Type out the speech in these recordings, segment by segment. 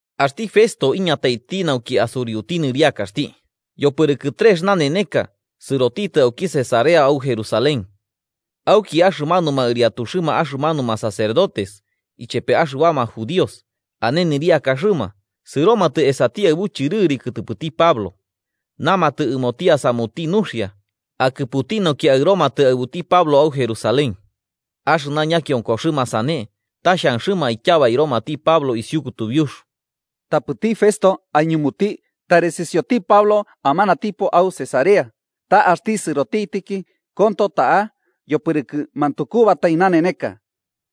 Axti Festo iñataiti nauki asuriuti nɨriakaxti, yopɨrɨkɨ trex naneneka sɨrotitɨ auki Cesarea au Jerusalén. Auki axɨmanuma ɨriatuxɨma axɨmanuma sacerdotes ichepe axɨbama judíos ane nɨriakaxɨma sɨromatɨ esati aɨbu chɨrɨri kɨtɨpɨti Pablo. Namatɨ ɨmoti asamuti nuxia, akɨputi nauki aɨromatɨ aɨbuti Pablo au Jerusalén. Axɨna ñakionkoxɨma sane ta xhanxɨma aityabairomati Pablo isiu kutubiux. Tapɨti Festo aiñumuti tari sɨsioti Pablo amanatipo au Cesarea, ta axti sɨrotitɨki konto ta'a yopɨrɨkɨ mantukubatai naneneka.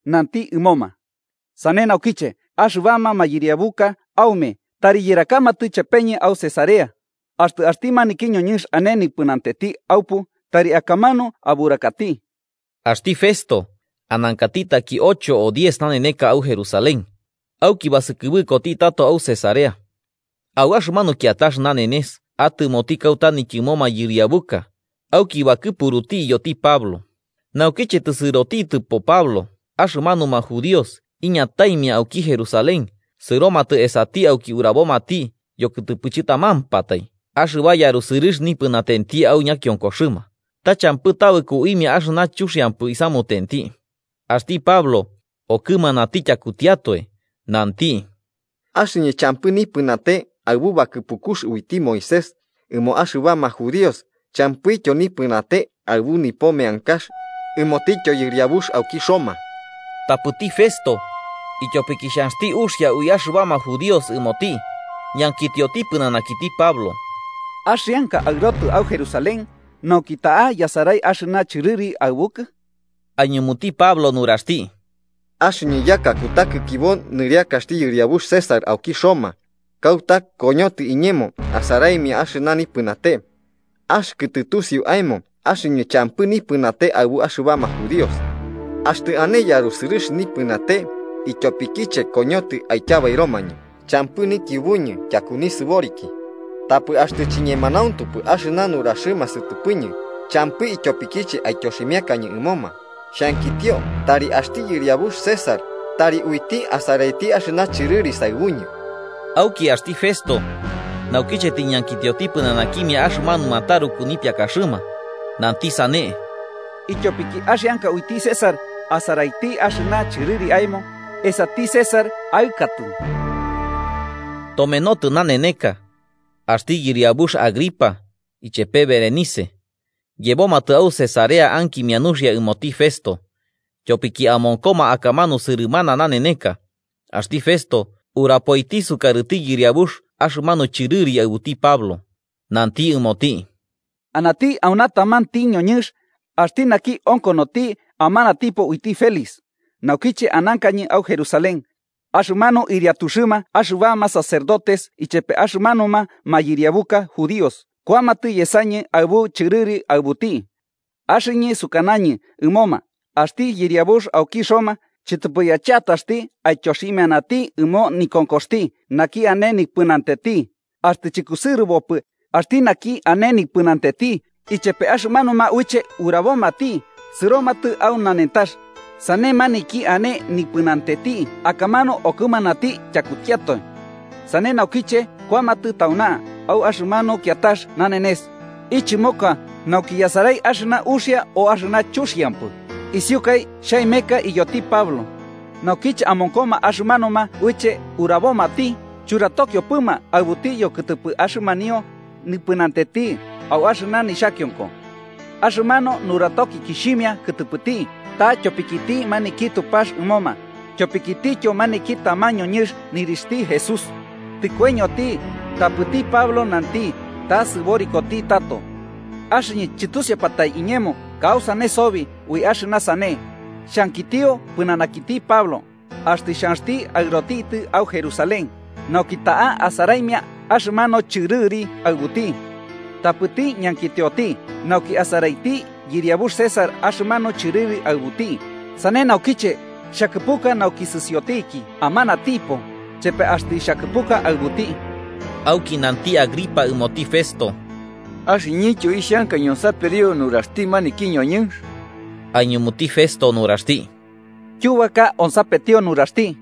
Nanti ɨmoma: –‘Sane naukiche, axɨbama mayɨriabuka aume tari yɨrakamatɨ chepeñɨ au Cesarea, axtɨ axti maniki ñoñɨnx ane nipɨnatenti aupu, tari akamanu aburakati.’ Axti Festo, anankati taki ocho o diez naneneka au Jerusalén, auki basɨkɨbɨkoti tato au Cesarea. Au axɨmanu kiatax nanenes atɨmoti kauta nityɨmo mayɨriabuka auki bakɨpuruti iyoti Pablo. Naukiche tɨsɨrotitɨpo Pablo, axɨmanuma judíos iñataimia auki Jerusalén sɨromatɨ esati auki urabomati yokɨtɨpɨ chɨtamampatai axɨba yarusɨrɨx nipɨnatenti au ñakionkoxɨma, ta champɨ tabɨko uimia axɨna chuxiampɨ isamutenti. Axti Pablo, okɨmanati tyakutiatoe, nanti: –Axɨñɨ champɨ nipɨnate aɨbu bakɨpukux uiti Moisés ɨmo axɨbama judíos, champɨityo nipɨnate aɨbu nipo meankax ɨmotityo yɨriabux auki Roma. Tapɨti Festo, ityopiki xhanxti uxia ui axɨbama judíos ɨmoti, ñankitioti pɨnanakiti Pablo: –¿Axianka aɨrotɨ au Jerusalén, nauki ta'a yasarai axɨna chɨrɨri aɨbukɨ? Aiñumuti Pablo nuraxti: –Axɨñɨ yaka kutakikibo nɨriakaxti yɨriabux César auki Roma, kauta koñotɨ iñemo asaraimia axɨna nipɨnate. Axɨkɨ tɨtusiu aemo, axɨñɨ champɨ nipɨnate aɨbuma axɨbama judíos. Axtɨ ane yarusɨrɨx nipɨnate ityopikiche koñotɨ aityabairomañɨ, champɨ nikiubuñɨ tyaku nisɨboriki. Tapɨ axtɨ chiñemanauntupɨ axɨna nuraxɨma sɨtɨpɨñɨ, champɨ ityopikiche aityoximiakañɨ ɨmoma. Xhankitio tari axti yɨriabux César tari uiti asaraiti axɨna chɨrɨri saɨbuñɨ. Auki axti Festo, naukiche tiñankitioti pɨnanakimia axɨmanuma taruku nipiakaxɨma, nanti sane: –Ityopiki axianka uiti César asaraiti axɨna chɨrɨri aemo, esati César aɨkatɨ. Tomenotɨ naneneka, axti yɨriabux Agripa ichepe Berenice, yebomatɨ au Cesarea ankimia nuxia ɨmoti Festo. Tyopiki amonkoma akamanu sɨrɨmana naneneka, axti Festo urapoiti sukarɨti yɨriabux axɨmanu chɨrɨri aɨbuti Pablo. Nanti ɨmoti: –Anati auna tamanti ñoñɨnx, axti naki onkonoti amanatipo uiti Félix. Naukiche anankañɨ au Jerusalén, axɨmanuma ɨriatuxɨma axɨbama sacerdotes ichepe axɨmanuma mayɨriabuka judíos kuamatɨ yesañɨ aɨbu chɨrɨri aɨbuti. Axɨñɨ sukanañɨ ɨmoma, axti yɨriabux auki Roma chɨtɨpɨ yacheataxti aityoximianati ɨmo nikonkoxti naki ane nipɨnatenti, axtɨ chɨkusɨrɨbopɨ axti naki ane nipɨnatenti ichepe axɨmanuma uiche urabomati sɨromatɨ au nanentax, sane maniki ane nipɨnatenti akamanu okɨmanati tyakutiatoe. Sane naukiche kuamatɨ tauna, au axɨmanu kiatax nanenes ichɨmoka nauki yasarai axɨna uxia o axɨna chuxiampɨ, isiukai xhaemeka iyoti Pablo. Naukiche amonkoma axɨmanuma uiche urabomati, churatokiopɨma aɨbuti yokɨtɨpɨ axɨmanio nipɨnatenti au axɨna nixhakionko. Axɨmanu nuratokikixhimia kɨtɨpɨti, ta tyopikiti maniki Tupax ɨmoma, tyopikitityo maniki taman ñoñɨnx nɨrixhti Jesús, tɨkoiñoti, tapɨti Pablo nanti ta sɨborikoti tato. Axɨñɨ chɨtusiupatae iñemo kausane sobi ui axɨna sane, xhankitio pɨnanakiti Pablo, axtɨ xhanxti aɨrotitɨ au Jerusalén, nauki ta'a asaraimia axɨmanu chɨrɨri aɨbuti. Tapɨti ñankitioti, nauki asaraiti yɨriabux César axɨmanu chɨrɨri aɨbuti, sane naukiche xhakɨpuka nauki sɨsiotiki amanatipo, chepe axtɨ xhakɨpuka aɨbuti. Auki nanti Agripa ɨmoti Festo: –Axɨñɨntyo ixhanka ñonsaperio nuraxti axti maniki ñoñɨnx. Aiñumuti Festo nuraxti: –Tyubaka onsapetio nuraxti.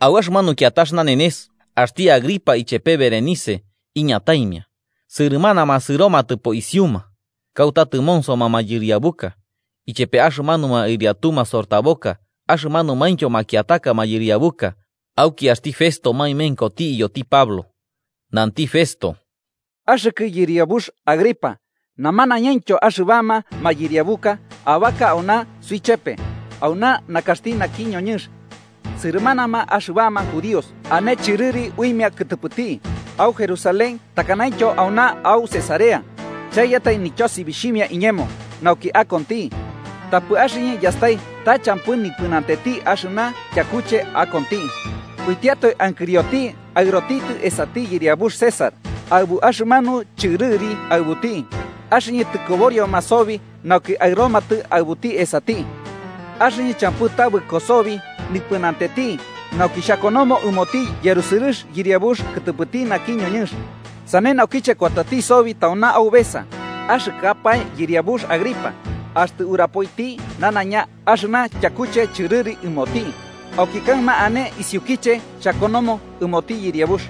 Au axɨmanu kiatax nanenes, axti Agripa ichepe Berenice iñataimia, sɨrɨmanama sɨromatɨpo isiuma, kauta tɨmonsoma mayɨriabuka, ichepema axɨmanuma ɨriatu masortaboka axɨmanumaintyo makiataka mayɨriabuka, auki axti Festo maemenkoti iyoti Pablo. Nanti Festo: –Axɨkɨ yɨriabux Agripa, namanañaintyo axɨbama mayɨriabuka abaka auna suichepe, auna nakaxti naki ñoñɨnx. Sɨrɨmanama axɨbama judíos ane chɨrɨri uimia kɨtɨpɨti, au Jerusalén takanaintyo auna au Cesarea, chaiyatai nityosibixhimia iñemo nauki akonti. Tapɨ axɨñɨ yastai ta champɨ nipɨnatenti axɨna tyakuche akonti, uitiatoe ankirioti aɨrotitɨ esati yɨriabux César aɨbu axɨmanu chɨrɨri aɨbuti, axɨñɨ tɨkoborioma sobi nauki aɨromatɨ aɨbuti esati. Axɨñɨ champɨ tabɨko sobi nipɨnatenti nauki xhakonomo ɨmoti yarusɨrɨx yɨriabux kɨtɨpɨti naki ñoñɨnx. Sane naukiche kuatati sobi tauna aubesa, axɨkɨapae yɨriabux Agripa, axtɨ urapoiti nanaiña axɨna tyakuche chɨrɨri ɨmoti, auki kaɨma ane isiukiche xhakonomo ɨmoti yɨriabux.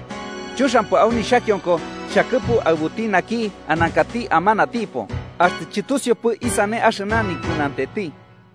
Chuxiampɨ au nixhakionko xhakɨpu aɨbuti naki anankati amanatipo, axtɨ chɨtusiupɨ isane axɨna nipɨnatenti.